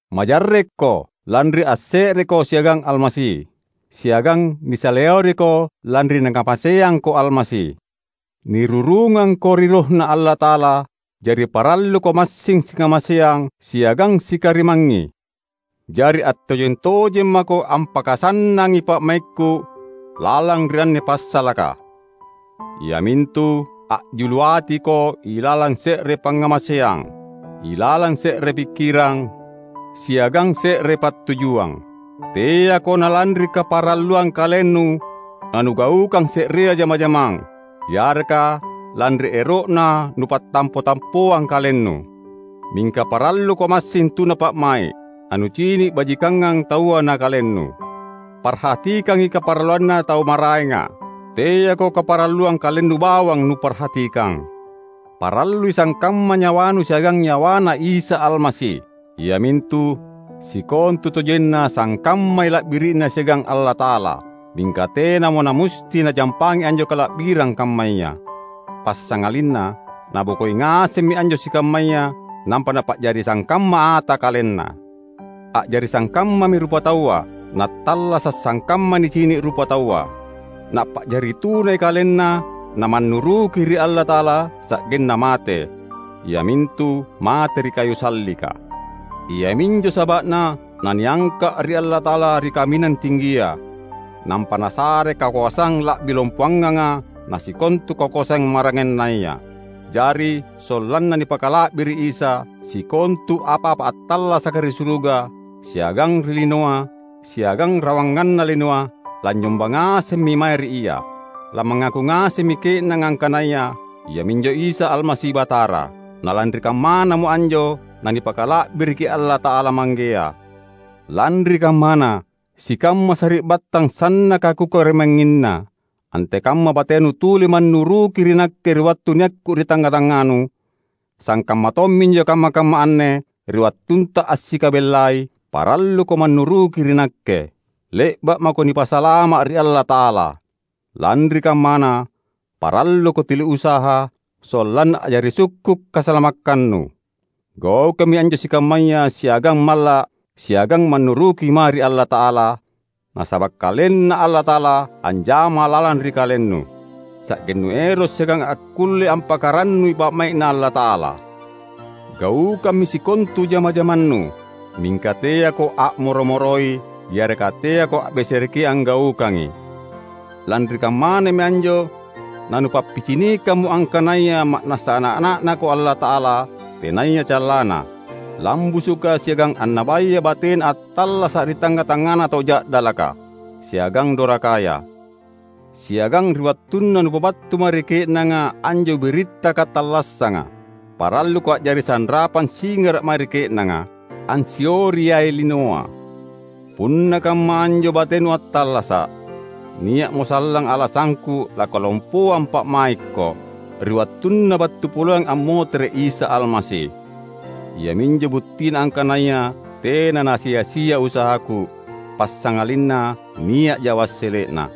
Majarrekko, lanri asse’reko siagang Almasi. Siagang nisaleoriko lanri Nakamaseangko Almasi! Nirurungangko ri RohNa Allata’ala, jari paralluko massing sikamaseang siagang sikarimangngi. Jari attojeng-tojeng mako ampakasannangi pa’maikku lalang ri anne passalaka, iamintu: A’julu atiko ilalang se’re pangngamaseang, ilalang se’re pikkirang, siagang se’re pattujuang. Teako na lanri kaparalluang kalennu nanugaukang se’rea jama-jamang, yareka lanri ero’na nupattampo-tampoang kalennu. Mingka paralluko massing tuna pa’mai’, nanucini’ bajikangang taua na kalennu. Parhatikangi kaparalluanna tau maraenga; teako kaparalluang kalennu bawang nuparhatikang. Parallui sangkamma nyawanu siagang nyawaNa Isa Almasi; iamintu: Sikontutojenna sangkammai la’biri’Na siagang Allata’ala, mingka tenamo namusti Najampangi anjo kala’birang kammaya. Passangalinna, Nabokoi ngasemmi anjo sikammaya nampa Napa’jari sangkamma ata KalenNa. A’jari sangkammami rupataua, Nattallasa’ sangkamma nicini’ rupataua. Napa’jari tunai KalenNa namannuruki ri Allata’ala sa’genna mate — iamintu mate ri kayu sallika. Iaminjo saba’na naniangka’ ri Allata’ala ri kaminang tinggia, nampa Nasare kakoasang la’bi lompoanganga na sikontu kakoasang maraengannaya. Jari, sollanna nipakala’biri’ Isa, sikontu apa-apa attallasaka ri suruga, siagang ri linoa, siagang rawanganna linoa, lanynyomba ngasemmi mae ri Ia. Lamangaku ngasemmi ke’nanga angkanaya Ia minjo Isa Almasi Batara; na lanri kammanamo anjo nanipakala’biriki Allata’ala Manggea. Lanri kammana, sikamma sari’battang sannaka kukarimangnginna, antekamma batenu tuli mannuruki ri nakke ri wattu niakku ri tangnga-tangnganu, sangkamma tomminjo kamma-kamma anne, ri wattunta assikabellai, paralluko mannuruki ri nakke. Le’ba’ mako nipasalama’ ri Allata’ala. Lanri kammana, paralluko tuli usaha, sollanna a’jari sukku’ kasalamakkannu. Gaukammi anjo sikammaya siagang malla’ siagang mannuruki mae ri Allata’ala; nasaba’ KalenNa Allata’ala anjama lalang ri kalennu, sa’gennu ero’ siagang akkulle ampakarannui pa’mai’Na Allata’ala. Gaukammi sikontu jama-jamannu; mingka teako a’moro-moroi yareka teako a’besereki anggaukangi. Lanri kammanami anjo nanupappicinikammo angkanaya ma’nassa ana’-ana’Nako Allata’ala tenaya callanna, lambusuka siagang annabaya batena attallasa’ ri tangnga-tangngana tau ja’dalaka siagang dorakaya. Siagang ri wattunna nupabattu mae ri ke’nanga anjo biritta katallassanga, paralluko a’jari sanrapang singara’ mae ri ke’nanga, ansioriai linoa. Punna kamma anjo batenu attallasa’, nia’mo sallang alasangku langkalompoang pa’maikko, ri wattunna battu poleang ammotere’ Isa Almasi. Iaminjo buttina angkanaya tena nasia-sia usahaku, passangalinna nia’ja wassele’na.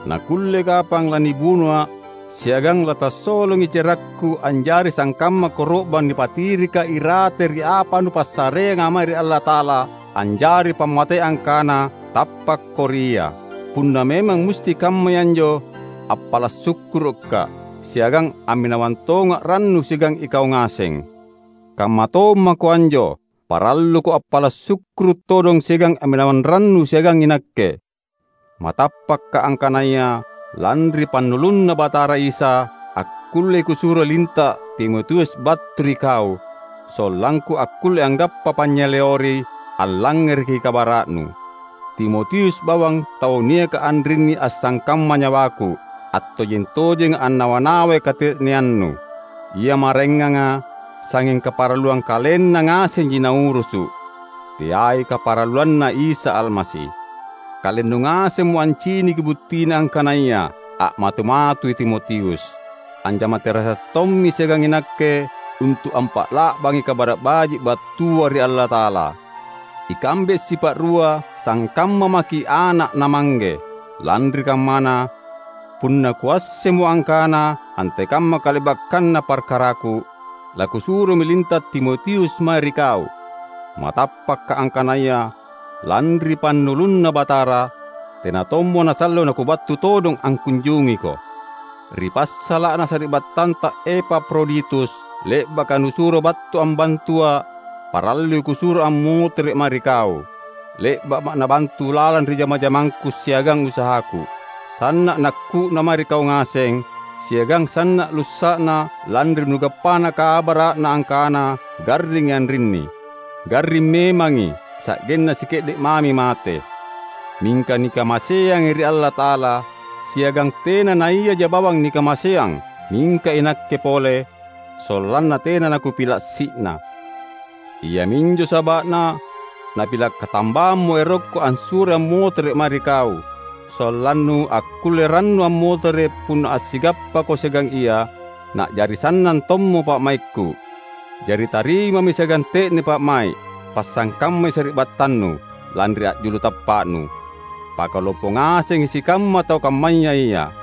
Nakulle kapang lanibunoa’ siagang latassolongi cerakku anjari sangkamma koro’bang nipatirika irate ri apa nupassareanga mae ri Allata’ala anjari’ pammatei angkana tappakko ri Ia. Punna memang musti kammai anjo, appala’ sukkuruka’, siagang amminawang tonga’ rannu siagang ikau ngaseng. Kamma tommako anjo, paralluko appala’ sukkuru’ todong siagang amminawang rannu siagang inakke. Matappaka’ angkanaya lanri pannulunNa Batara Isa, akkullei kusuro linta’ Timotius battu ri kau; sollangku akkulle anggappa panynyaleori allangngereki kabara’nu. Timotius bawang tau niaka anrinni assangkamma nyawaku, attojeng-tojenga annawa-nawai kate’neannu. Ia maraenganga sangnging kaparalluang kalenna ngasenji naurusu’; teai kaparalluanNa Isa Almasi. Kalennu ngasemmo anciniki buttina angkanaya a’matu-matui Timotius. Anjama terasa’ tommi siagang inakke untu’ ampa’la’bangi Kabara’ Baji’ battua ri Allata’ala. Ikambe sipa’rua sangkamma maki’ ana’ na mangge. Lanri kammana, punna kuassemmo angkana antekamma kale’bakkanna parkaraku, lakusuromi linta’ Timotius mae ri kau. Matappaka’ angkanaya lanri pannulunNa Batara, tena tommo nasallo nakubattu todong angkunjungiko. Ri passala’na sari’battanta Epafroditus, le’baka nusuro battu ambantua’, parallui kusuro ammotere’ mae ri kau. Le’ba’ma’ nabantu lalang ri jama-jamangku siagang usahaku. Sanna’ nakku’na mae ri kau ngaseng; siagang sanna’ lussa’na lanri nugappana kabara’na angkana garringi anrinni. Garring memangi, sa’genna sike’de’ mami mate. Mingka nikamaseangi ri Allata’ala; siagang tena naiaja bawang nikamaseang, mingka inakke pole, sollanna tena nakupila’ si’na. Iaminjo saba’na napila’ katambammo erokku assuroi ammotere’ mae ri kau; sollannu akkulle rannu ammotere’ punna assigappako siagang ia, na’jari sannang tommo pa’maikku. Jari, tarimami siagang te’ne pa’mai’. Pasangkammai sari’battannu, lanri a’julu tappa’nu. Pakalompo ngasengi sikamma tau kammaya ia.